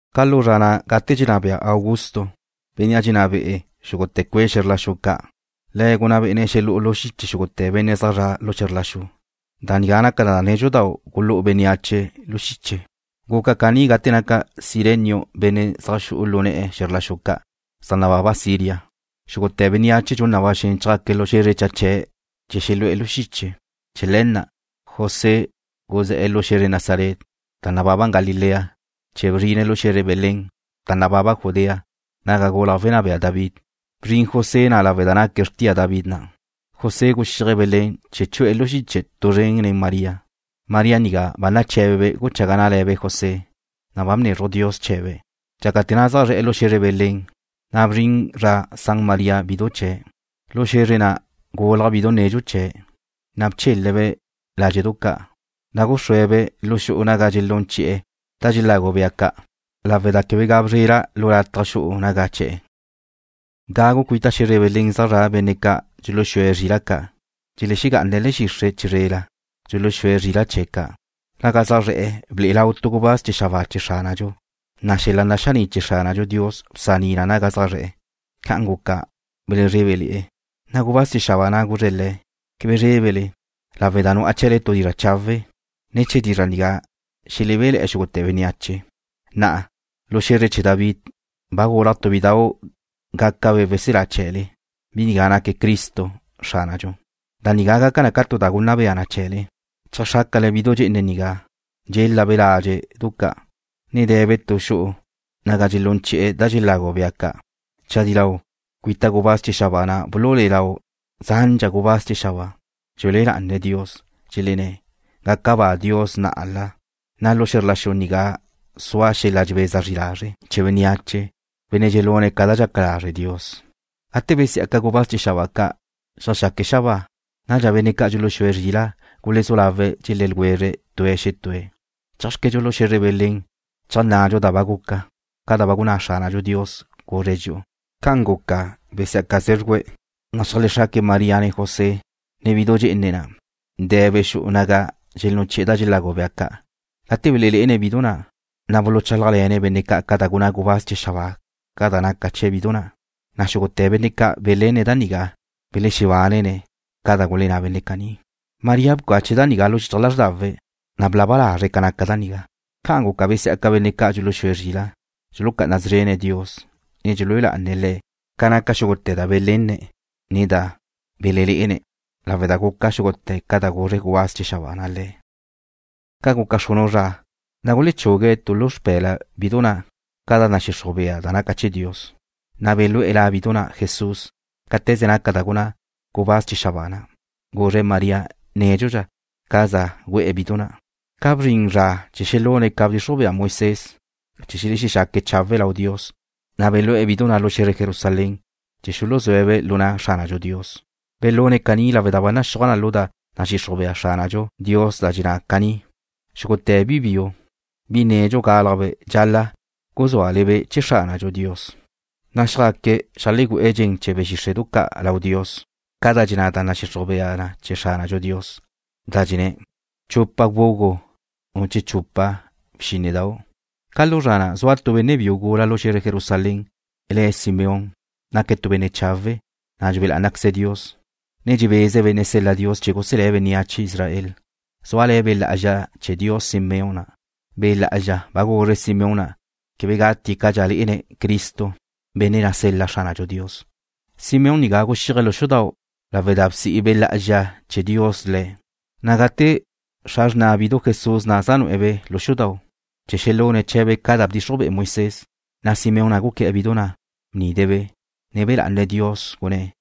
Ca lu zra na' gate dxenná bea Augusto, benne' xe̱zre Roma, benne' dxenná be'e̱ xúgute̱ cue' xe̱zr la xu, le̱' gunná bé'ene̱' xelú'u lu xiche xúgute̱ benne' zaj zre̱'e̱ xe̱zr la xu. Da nigá naca da nédxudau' gulú'u bénneache lu xiche. Guca caní gate naca Cirenio benne' zaj xu'u lu ne̱'e̱ xe̱zre ca' zaj nababa Siria. Xúgute̱ bénneache dxun na ba xen chjaque̱' lu xe̱zre naga zaj nababe̱' chee̱ xelu'e̱ lu xiche. Chee̱ le̱ na' José guzé̱'e̱ lu xe̱zre Nazaret, da nababa Galilea, chee̱ bzrine̱' lu xe̱zre Belén, da nababa Judea, naga gulaj wenná bea David. Bzrin José na' lawe' da naque̱' xrtia David na'. José guxíaje̱' Belén chee̱ chu'e̱ lu xiche tu zren nen María. María nigá ba naché̱bebe' guchaga ná'ale̱be' José, na' ba bnezruj Dios chee̱be'. Dxácate̱ na' zaj zre̱'e̱ lu xe̱zre Belén, na' bzrin zra san María bidu chee̱'. Lu xe̱zre na' gulaj bidu nedxu chee̱', na' bchele̱'-be' ládxe'du ca', na' gúxrue̱'-be' xu'u naga dxelún chi'e̱ da dxelagu bea ca', lawe' da quebe ga bzrela tu lataj lu xu'u naga che̱'e̱. Gagu cuita xe̱zre Belén zaj zra' benne' ca' dxuluxúe̱' zrila' ca', dxelexegá'ane̱' le̱'e̱ xixre' chizrela, dxuluxúe̱' zrila' chee̱' ca'. Naga zaj zre̱'e̱ ble'e lau tu gubáz chee̱ xabáa chee̱ Xránadxu. Na' xel-la naxaní' chee̱ Xránadxu Dios bsaní na naga zaj zre̱'e̱. Ca'an guca, belezrébele̱'e̱. Na' gubáz chee̱ xabáa na' guzre̱' le̱': ―Quebe zrébele, lawe' da dxuzenla' le'e tu dizra' chawe'. Ne̱ chee̱ dizra' nigá xelebéle̱'e̱ xúgute̱ bénneache. Na'a, lu xe̱zre chee̱ David, ba gulaj tu bidau' gácabe' weselá chee̱le. Bi nigá naque̱' Cristo, Xránadxu. Da nigá gaca na tu da gunna bea na chee̱le. Cheajxrácale bidu dxe'ene nigá, dxélabe' ládxe'du ca', ne de̱be' tu xu'u naga dxelún chi'e̱ da xelagu bea ca'. Chadí lau, cuita gubáz chee̱ xabáa na' bululé'e lau zandxa gubáz chee̱ xabáa, dxelúe lá'ane̱' Dios, dxelenné̱': ¡Gaca ba Dios na'ala, na' lu xe̱zr la xu nigá sua xel-la dxebeza zri lazre' chee̱ bénneache, benne' dxelune̱' ca da dxaca lazre' Dios! Gate besí'aca gubáz chee̱ xabáa ca', zeajxaque̱' xabáa, nadxa benne' ca' dxuluxúe̱' zrila' gulezú lawe̱' dxelé̱' ljwezre̱' tue̱' xetúe̱': ―Chéajxquedxu lu xe̱zre Belén cheajnnadxu da ba guca, ca da ba gunná Xránadxu Dios, guzre̱' dxi'u. Ca'an guca, besí'aca zé̱zxuje̱', na' xeajlexraque̱' María ne José, ne bidu dxe'ene na', de̱be' xu'u naga dxelún chi'e̱ da xelagu bea ca'. Gate belelé'ene̱' bidu na', na' buluchálajle̱ne̱' benne' ca' ca da gunná gubáz chee̱ xabáa ca da naca chee̱ bidu na'. Na' xúgute̱ benne' ca' belenne̱' da nigá belexebánele̱'e̱ne̱' ca da gulenná benne' caní. María bcache̱' da nigá lu xichaj lázrdawe̱', na' blaba lazre̱' ca naca da nigá. Ca'an guca besí'aca benne' ca' dxuluxúe zrila', dxulucá'ana szrene̱' Dios, ne dxelúe lá'ane̱' Le̱' ca naca xúgute̱ da belenne̱', ne da belelé'ene̱', lawe' da guca xúgute̱ ca da guzre gubáz chee̱ xabáa na' le̱'. Ca guca xrunu' zra, na' gulechugue̱' tu lu xpe̱la bidu na' ca da nadxixruj bea na chee̱ Dios, na' belú'e̱ La bidu na' Jesús, cáte̱ze naca da gunná gubáz chee̱ xabáa na', guzre̱' María nédxudxa ca za gu'e̱ bidu na'. Ca bzrin zra chee̱ xelune̱' ca bdxixruj bea Moisés chee̱ xelexexaque̱' chawe' lau Dios, na' belú'e̱ bidu na' lu xe̱zre Jerusalén chee̱ xuluzúe̱'-be' lu na' Xránadxu Dios. Belune̱' caní lawe' da ba naxúaj lu da nadxixruj bea Xránadxu Dios da dxenná na caní: Xúgute̱ bi biu, bi nedxu gálajbe' dxal-la' guzúale-be' chee̱ Xránadxu Dios. Na' xjaque̱' xeajlegu'e̱ dxen chee̱ be̱ xíxre'du ca' lau Dios ca da dxenná da nadxixruj bea na chee̱ Xránadxu Dios, da dxenná na: Chupa bgugu, che chupa bxínnedau'. Ca lu zra na' zua tu benne' biu gula lu xe̱zre Jerusalén, le̱' Simeón. Naque̱' tu benne' chawe', na' dxue lá'anaqueze̱' Dios, ne dxebeze̱' benne' sel-la Dios chee̱ guselé̱' bénneache Israel. Zúale̱ Be' Lá'azxa chee̱ Dios Simeón na'. Be' Lá'azxa ba guzre̱' Simeón na' quebe gatie̱' cadxa lé'ene̱' Cristo, benne' na' sel-la Xránadxu Dios. Simeón nigá guxíaje̱' lu xudau' lawe' da bsi' Be' Lá'azxa chee̱ Dios le̱'. Na' gate xra xrna bidu Jesús zaj nu'e̱-be' lu xudau' chee̱ xelune̱' chee̱be' ca da bdxixruj be'e Moisés, na' Simeón na' guqué̱'e̱ bidu na'. Bnide̱'-be', ne be̱ lá'ane̱' Dios, gunné̱':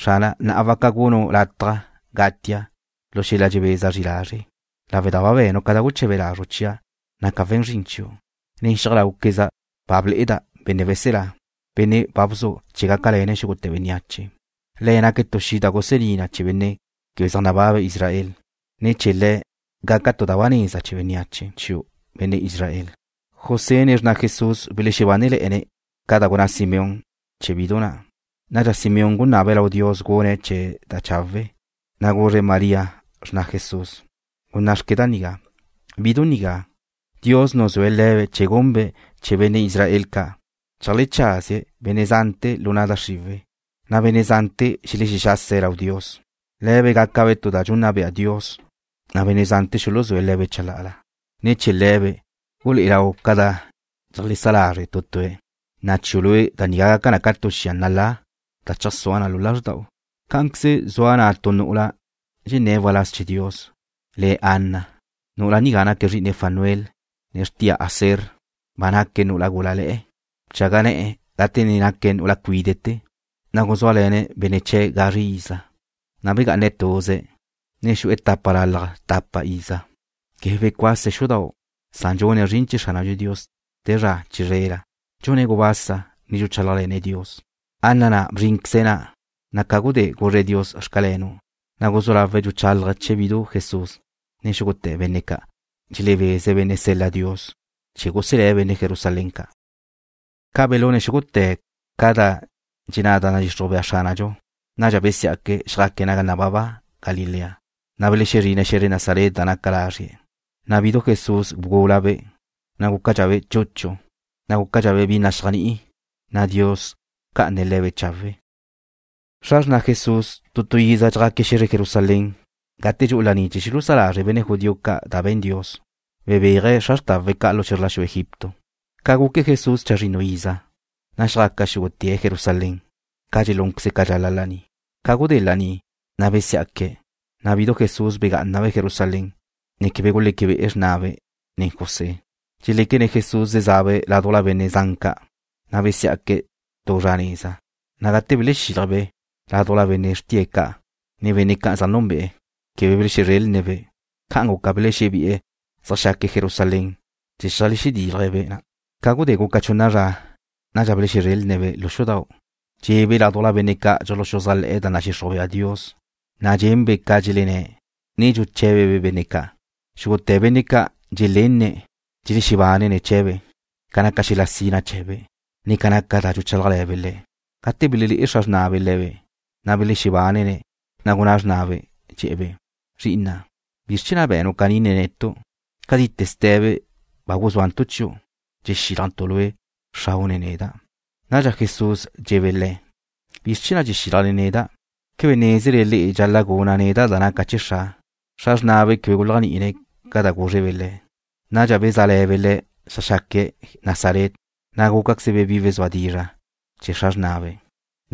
Xrana', na'a waca gunnu' lataj gatia' lu xel-la dxebeza zri lazre' lawe' da ba be̱nu' ca da guche̱be lazru' chia', naca' we̱n zrin chiu'. Nen xiaj láuqueza' ba ble'eda' Benne' Weselá, Bénnea' ba bzu' chee̱ gácalene̱' xúgute̱ bénneache. Le̱' naque̱' tu xi' da gusení na chee̱ benne' quebe zaj nababe̱' Israel. Ne̱ chee̱ Le̱' gaca tu da ba neza chee̱ bénneache chiu', benne' Israel. José ne xrna Jesús belexebánele̱'e̱ne̱' ca da gunná Simeón chee̱ bidu Jesús. Nadxa Simeón gunabe̱' lau Dios gune̱' chee̱' da chawe', na' guzre̱' María, xrna Jesús: ―¡Gunná'xque nigá! Bidu nigá, Dios nuzúe̱' le̱be' chee̱ gunbe' chee̱ benne' Israel ca', cheajlecházie̱' benne' zante̱ lu na' da xriwe̱', na' benne' zante̱ xelexexase̱' lau Dios. Le̱be' gácabe' tu da dxunna bea chee̱ Dios, na' benne' zante̱ xuluzúe̱' le̱be' chalá'ala. Ne̱ chee̱ le̱be' gulé'e lau ca da dxeajlesá lazre' tu tue̱'. Na' chiu' lue' da nigá gaca na ca tu xia nalá, da cheajsúa lu lázrda'u. Cá'anqueze zua na' tu nu'ula dxenné̱' waláz chee̱ Dios, le̱' Ana. Nu'ula nigá naque̱' zri'ine Fanuel, ne xrtia Aser. Ba naque̱' nu'ula gúlale̱'e̱. Bchaga ne̱'e̱ gate na' naque̱' nu'ula cuíde'te̱, na' guzúale̱ne̱' benne' chee̱' gazre iza. Na' begá'ane̱' tuze̱', ne ba xu'e̱ tapa lalaj tapa iza. Quebe becuase̱' xudau', na' dxune̱' zrin chee̱ Xránadxu Dios te zra chizrela. Dxune̱' gubasa, ne dxuchálajle̱ne̱' Dios. Ana na' bzrínqueze̱' na', na' ca gudé guzre̱' Dios: “Xcalenu'”, na' guzú lawe̱' dxuchálaje̱' chee̱ bidu Jesús nen xúgute̱ benne' ca' dxelebeze̱' benne' na' sel-la Dios chee̱ guselé̱' benne' Jerusalén ca'. Ca belune̱' xúgute̱ ca da dxenná da nadxixruj bea Xránadxu, nadxa besiá'que̱' xjaque̱' naga nababa Galilea, na' belexezrine̱' xe̱zre Nazaret da naca lazrie̱'. Na' bidu Jesús bgúlabe', ne gúcadxabe' chuchu, ne gúcadxabe' bi naxéajni'i, na' Dios bca'ane̱' le̱be' chawe'. Xra xrna' Jesús, tu tu iza dxjá'aque̱' xe̱zre Jerusalén gate dxu'u laní chee̱ xulusá lazre' benne' judío ca da be̱n Dios, bebéaje̱' xra xrtawe̱' ca' lu xe̱zr la xu Egipto. Ca guque Jesús chazrinnu iza, na' xjá'aque̱' xúgute̱' Jerusalén, ca dxelúnqueze̱' ca dxaca laní. Ca gudé laní, na' besiá'que̱', na' bidu Jesús begá'anabe' Jerusalén, ne quebe guleque be'e xrnabe', ne José. Dxeléquene̱' Jesús zezabe' ládujla benne' zan ca', na' besiá'que̱' tu zra nez. Gate belexilje̱'-be' ládujla benne' xrtie̱' ca', ne benne' ca' zaj núnbe'e̱, quebe belexezrélne̱'-be'. Ca'an guca belexebi'e̱ zeajxá'aque̱' Jerusalén chee̱ cheajlexedílje̱'-be' na'. Ca gudé guca chunna zra, nadxa belexezrélne̱'-be' lu xudau', dxe'ebe' ládujla benne' ca' dxuluxuzájle̱'e̱ da nadxixruj bea Dios, na' dxenbe' ca dxelenné̱', ne dxuché̱bebe' benne' ca'. Xúgute̱ benne' ca' dxelenne̱' dxelexebánene̱' chee̱be' ca naca xel-la sina chee̱be', ne ca naca da dxuchálajle̱be' le̱'. Gate belelé'e xra xrnabe' le̱be', na' belexebánene̱'. Na' gunná xrnabe', dxe̱'e̱-be': ―Zri'ina', ¿bizr chee̱ na' be̱nu' caní nen netu'? Cadite ste̱be ba guzúantu' chiu' dxexílajntu' lue', xrau' ne neda'. Nadxa Jesús dxe̱'e̱be' le̱': ―¿Bizr chee̱ na' dxexílajle neda'? ¿Quebe nézele le'e dxal-la' guna' neda' da naca chee̱ Xra'? Xra xrnabe' quebe guléajni'ine̱' ca da gúzrebe' le̱'. Nadxa bezále̱be' le̱' zeajxá'aque̱' Nazaret, na' gúcaquezebe' bi wezúa dizra' chee̱ xra xrnabe'.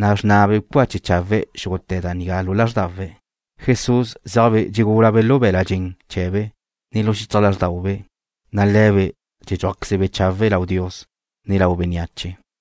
Na' xrnabe' bcache chawe̱' xúgute̱ da nigá lu lázrdawe̱'. Jesús zéajbe' dxegúlabe' lu be̱l-la' dxen chee̱be', ne lu xichaj lázrdaube', na' dxedxúajquezebe' chawe' lau Dios, ne lau bénneache.